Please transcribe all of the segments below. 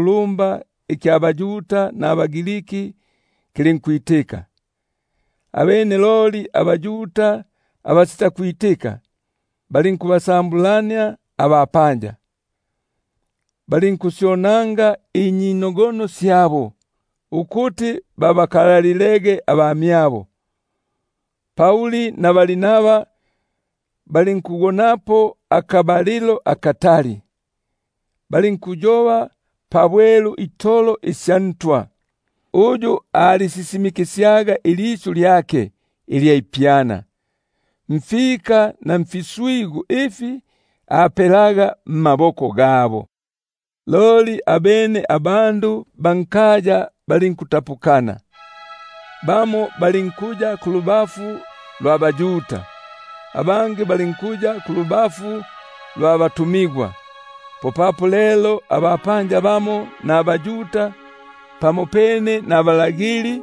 lumba ikya baYuda nabaGriki kilinkwitika. Abene loli abaYuda abasitakwitika, balinkubasambulania abapanja, balinkusyonanga inyinogono syabo, ukuti babakalalilege abamyabo. Lelo popapo balinkugonapo akabalilo akatali, balinkuyoba pabwelu itolo mungamu ya Ntwa, uyu alisisimikisyaga ilisyu lyake ilya ipyana, mfika na mfiswigu ifi apelelaga mmaboko gabo. Loli abene abandu ba nkaya balinkutapukana; bamo balinkuya kulubafu lwa baYuda, abangi balinkuya kulubafu lwa batumigwa. Lelo bo abapanja nabaYuda pamopene nabalagili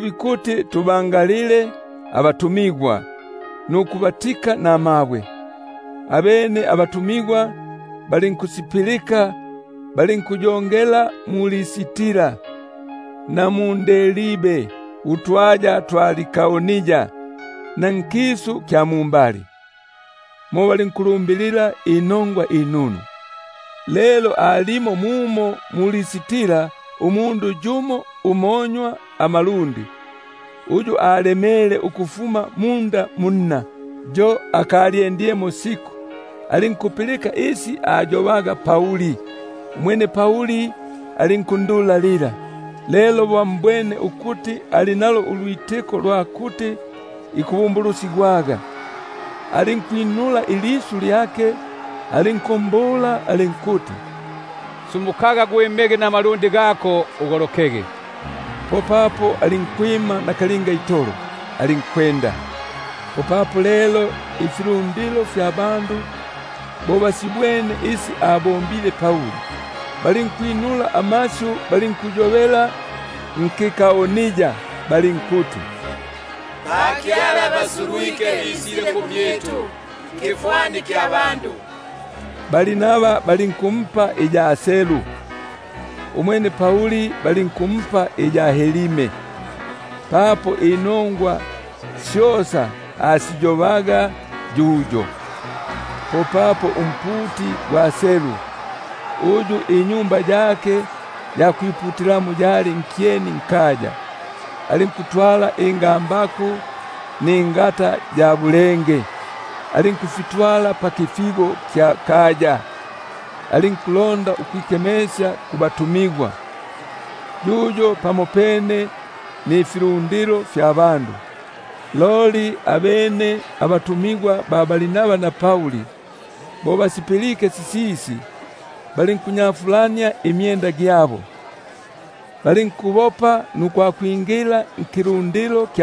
bikuti tubangalile nukubatika namabwe, abene balinkupilika, balinkuyongela mu-Listra na mu-Derbe utwaya twa Likaonia na nkisu kya mumbali; mo balinkufumusya inongwa inunu. Lelo alimo mumo mu-Listra umundu yumo umonywa amalundi, uyu alemele ukufuma munda munna, yo akalyendi- lemo siku. Alinkupilika isi ayobaga Pauli; umwene Pauli alinkundulalila. Lelo bo ambwene ukuti ali nalo ulwitiko ulwa kuti ikubumbulusigwaga, alinkuyoba ilisyu ilikulumba alinkuti: Sumukaga gwimege namalundi gako, ugolokege. Popapo alinkunyela itolo, alinkwenda. Lelo bo ifilundilo Asibwene isi abombile Pauli, popapo balinkwinula amasyu balinkuyobela nkiLikaonia balinkuti: Bakyala basulwike, bisile mmyitu nkifwani kya bandu. Barnaba balinkumpa iya Zeu, umwene Pauli balinkumpa iya Herme, papo inongwa syosa asiyobaga yuyo. Popapo umputi gwa Zeu, uyu tempeli gwake ali nkyeni nkaya, alinkutwala ingambaku ningata ya bulenge, alinkufitwala pakipata, alinkulonda ukwikemesya kumyabo, yuyo pamopene nifilundilo. Loli abene abatumigwa Barnaba na Pauli bo basipilike sisisi, balinkunyafulania imyenda gyabo, balinkubopa nukwakwingila nkilundilo,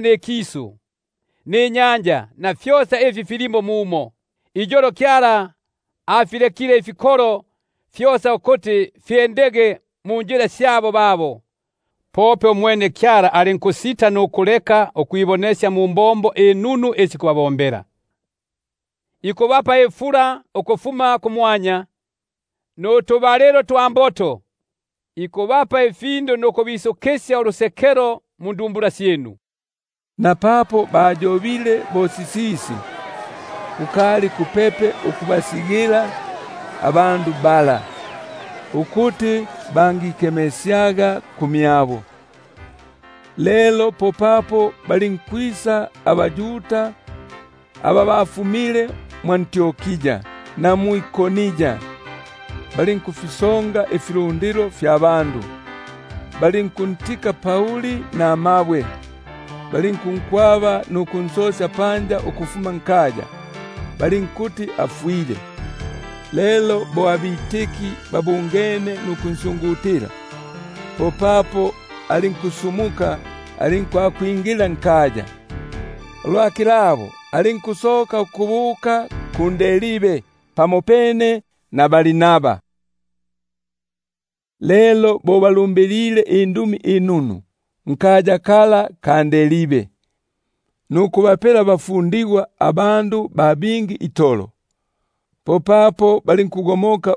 nikisu, ninyanja na fyosa ifi filimo mumo. Mungulilo isi sikindile, afilekile ifikolo fyosa ukuti fyendege munjila syabo; pope alinkusita nukuleka ukwibonesya mumbombo inunu isi ikubomba, ikubapa ifula ukufuma kumwanya, nutubalilo twa mboto, ikubisusya ifindu nubusangalufu mundumbula syinu. Popapo balinkutamigwa fiyo pakufikanisya ifilundilo namasyu gagaga, ukuti bangikemesyaga kumyabo. Lelo popapo balinkwisa abaYuda aba bafumile mwʼAntiokia na mwʼIkoni, balinkufisonga ifilundilo, balinkuntika Pauli namabwe, balinkunkwaba nukunsosya nkaya, balinkuti afwile. Lelo bo abafundigwa bansyungutile, popapo alinkusumuka, alinkwakwingila nkaya. Ulwa kilabo, alinkusoka ukubuka mu-Derbe pamopene na Barnaba. Bikugomokela mwʼAntiokia Lelo bo balumbilile inongwa inunu nkaya kala, nukubapela bafundigwa abandu ba bingi itolo, popapo balinkugomoka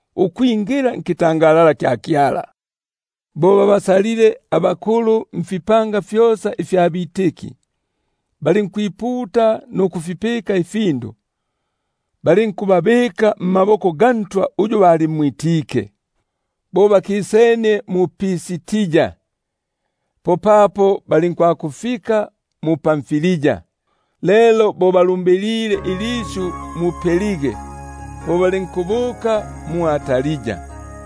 ukwingila mbutwa bwa Kyala. Bo babimike abakulu mfipanga fyosa, balinkwiputa nukufipika ifindu, balinkubabika mmaboko ga Ntwa uyu balimwitike. Popapo balinkukisania mu-Pisidia, balinkwakufika mu-Pamfilia. Lelo bo balumbilile ilisyu mu-Perge, popapo balinkusuluka ukubuka mwʼAtalia.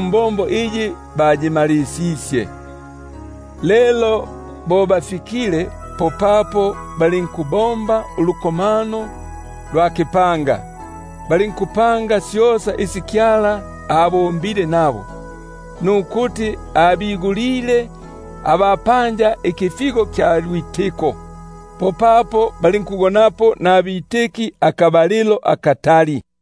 mbombo iyi bayimalisisye. Lelo bo bafikile, popapo balinkukibungania ikipanga, balinkupanga syosa isi Kyala abombile nabo, nukuti abigulile abapanja ikifigo kya lwitiko. Popapo balinkugonapo nabafundigwa akabalilo akatali.